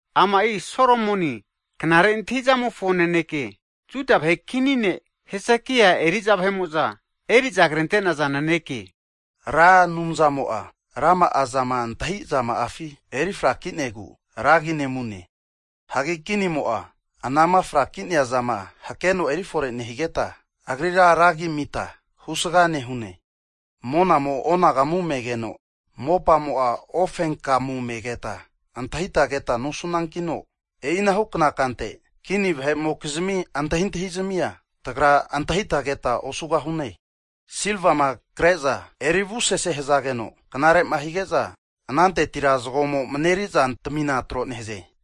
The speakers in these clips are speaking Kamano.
Ama'i Solomoni knare antahi'zamofo naneke, Juda vahe kini ne' Hezekia eriza vahe'mo'za eri'za krente'naza naneke. Ra Anumzamo'a rama'a zama antahizama'afi erifrakinegu, ra agi nemune. Hagi kinimo'a anama fraki'nea zama hakeno erifore nehigeta, agrira ra agi'a amita husga nehune. Monamo onagamu me'geno, mopamo'a ufenkamu megeta antahita keta nosunankino, e'inahukna kante kini vahe'mokizmi antahintahizmia tagra antahita keta osugahune. Silvama kre'za eri avusese hazageno, knare'ma hige'za anantetira zago'amo mareri zantamina tro nehaze.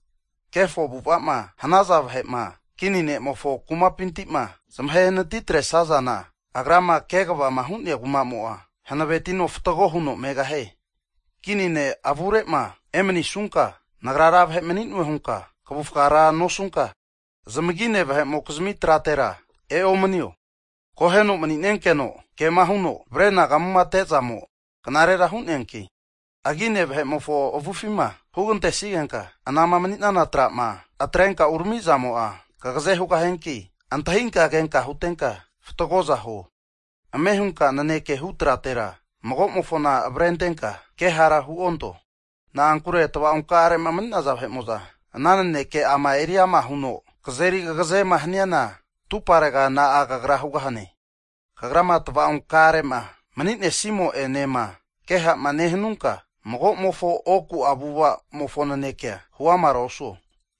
Kefo avu'ava'ma hanaza vahe'ma kini ne'mofo kumapinti'ma zamahenati atresazana, agrama kegavama hu'nea kuma'mo'a, hanavetino fatgo huno megahie. Kini ne' avure'ma emanisunka, nagra ra vahe'mani'noe hunka kavufga ra nosunka, zamagine vahe'mokizmi tratera eomanio. Akoheno mani'nenkeno kema huno avrenagamute zamo knarera hu'neanki, agine vahe'mofo avufima hugantesigenka anama mani'nenana tra'ma atrenka urami zamo'a kagaze hugahianki, antahinka kenka huntenka fatgoza huo. Ame hunka naneke hu tratera magomofona avrentenka kehara huonto. Na'ankure tava'onkare'ma mani'naza vahe'mo'za, ana nanekeka'ama eriama hu'za kazeri kagazema hanazana, atuparega na'a kagra hugahane? Kagrama tava'onkare'ma nemanisimo'enema ke ha'ma nehanunka, mago'mofo oku'a avu'ava'amofo nanekea hu amara osuo.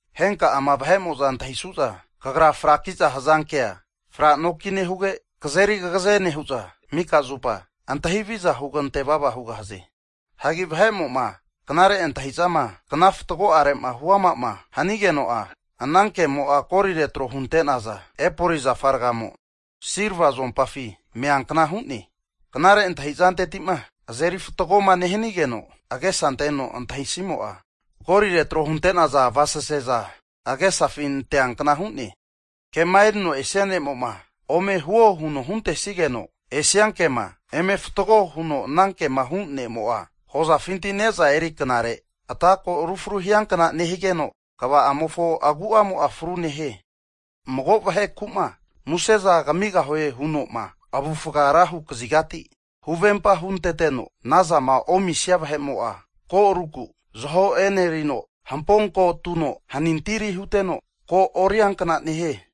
Henka'ama vahe'mo'za antahisu'za, fraki'za hazankea kagra franokine huge, kazeri kagaze nehu'za mika zupa antahi haviza hugante vava hugahaze. Hagi vahe'mo'ma knare antahi'zama kna fatgo'are'ma hu'ama'ma hanigeno'a, ana ke'mo'a golire tro hunte'naza epoli zafa ragamo silva zuompafi meankna hu'ne. Knare antahi'zanteti'ma azeri fatgoma nehanigeno agesa anteno antahisimo'a, golire tro hunte'naza avasaseza agesafi anteankna hu'ne. Kema erino esia ne'mo'ma, ome huo huno huntesigeno esia kema eme fatgo huno anankema hu ne'mo'a, hozafinti neza hamare knare ata ko'mo rufru hiankna nehigeno, kva'amofo agu'amo'a fru nehie. Mago vaheku'ma museza kamigahue huno'ma avufga ra hu kazigati huvempa hunteteno, anazama omisia vahe'mo'a, ko aruku zaho e'nerino hampo ko atuno hanintiri huteno, kora oriankna nehie.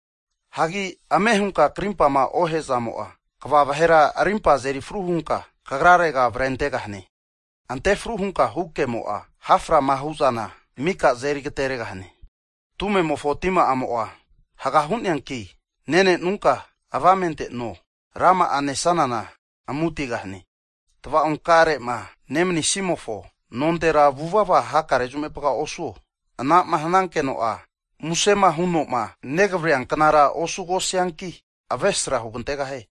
Hagi ame hunka krimpama ohe'zamo'a, kva vahera rimpa azerifru hunka, kagrarega avrentegahane. Ante fru hunka hukemo'a, ha' frama hu'zana mika azeri agateregahane. Tume'mofo tima'amo'a haga hu'neanki, nenenunka avamente no, rama'a nesanana amu'atigahane. Tava'onkare'ma nemanisimofo nontera hakare zupa vuvava osuo, anama hanankeno'a musema huno'ma negavreanknara osugosianki, avesra hugantegahie.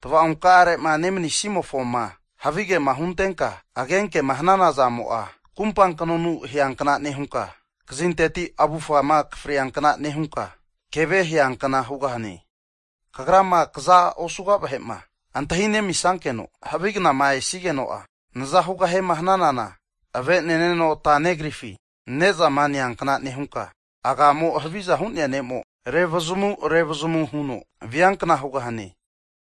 Tava'onkarema nemanisimofoma havigema huntenka, agenkema hanana zamo'a, kumpa knonu aheankna nehunka, kazinteti avufgama akafriankna nehunka, keve aheankna hugahane. Kagrama kaza osuga vahe'ma antahinemisankeno havi knama esigeno'a, naza hugahiema hananana, ave'neneno ata negrifi ne'zama neankna nehunka, agamo haviza hu'nea ne'mo revazamu revazamu huno viankna hugahane.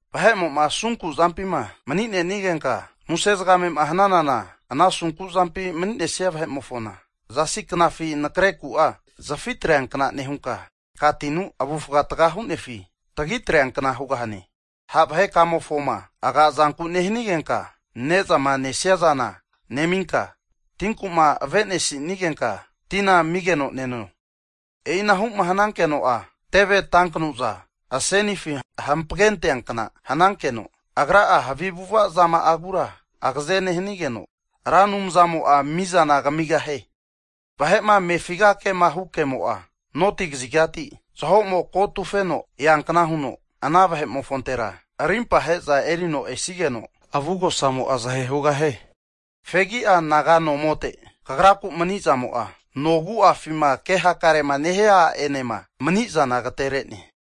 Vahe'mo'ma asunku zampima mani'nenigenka muse zagamema hananana, ana asunku zampi mani'nea vahe'mofona, zasi knafi nakreku'a zafi atreankna nehunka, aka tinu avufga taga hu'nefi tagi atreankna hugahane. Ha' vahekamofoma aga'zanku'ma nehanigenka ne'zama nesia zana neminka, tinku'ma avenesinigenka tina amigeno neno. E'inahu'ma hanankeno'a, teve tankanuza asenifi hampagenteankna hanankeno, agra'a havi avu'ava zama'agura agaze nehanigeno, Ra Anumzamo'a mizana kamigahie. Vahe'ma amefiga ke'ma hu kemo'a, noti (north) kazigati zaho'mo ko atufeno eankna huno, ana vahe'mofontera arimpa ahe'za erino esigeno, avugosamo'a zahe hugahie. Fegi'a anaga nomote kagraku manizamo'a, nogu'afima kehakarema nehia a'enema manizana agaterene.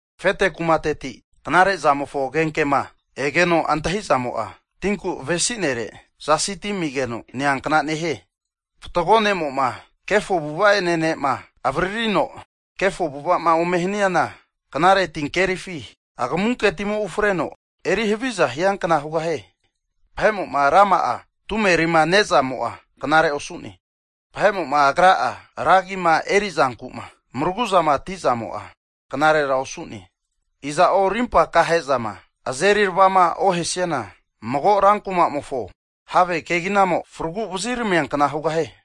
Afete kumateti knare'zamofo agenkema egeno antahizamo'a, tinku avesinere zasi ti amigeno neankna nehie. Fatgo ne'mo'ma kefo avu'ava ene ne'ma, avaririno kefo avu'ava'ma ome haniana, knare tinkerifi agamunke timo ufreno eri haviza hiankna hugahie. Vahe'mo'ma ra'ma'a tumerima ne'zamo'a, knarera osu'ne. Vahe'mo'ma agra'a ra agima eri'zanku'ma mraguzamati'zamo'a, knarera osu'ne. Iza'o, rimpa aka he'zama azeri aravama ohesiana, mago ra kuma'mofo have keginamo fragu vaziramiankna hugahie.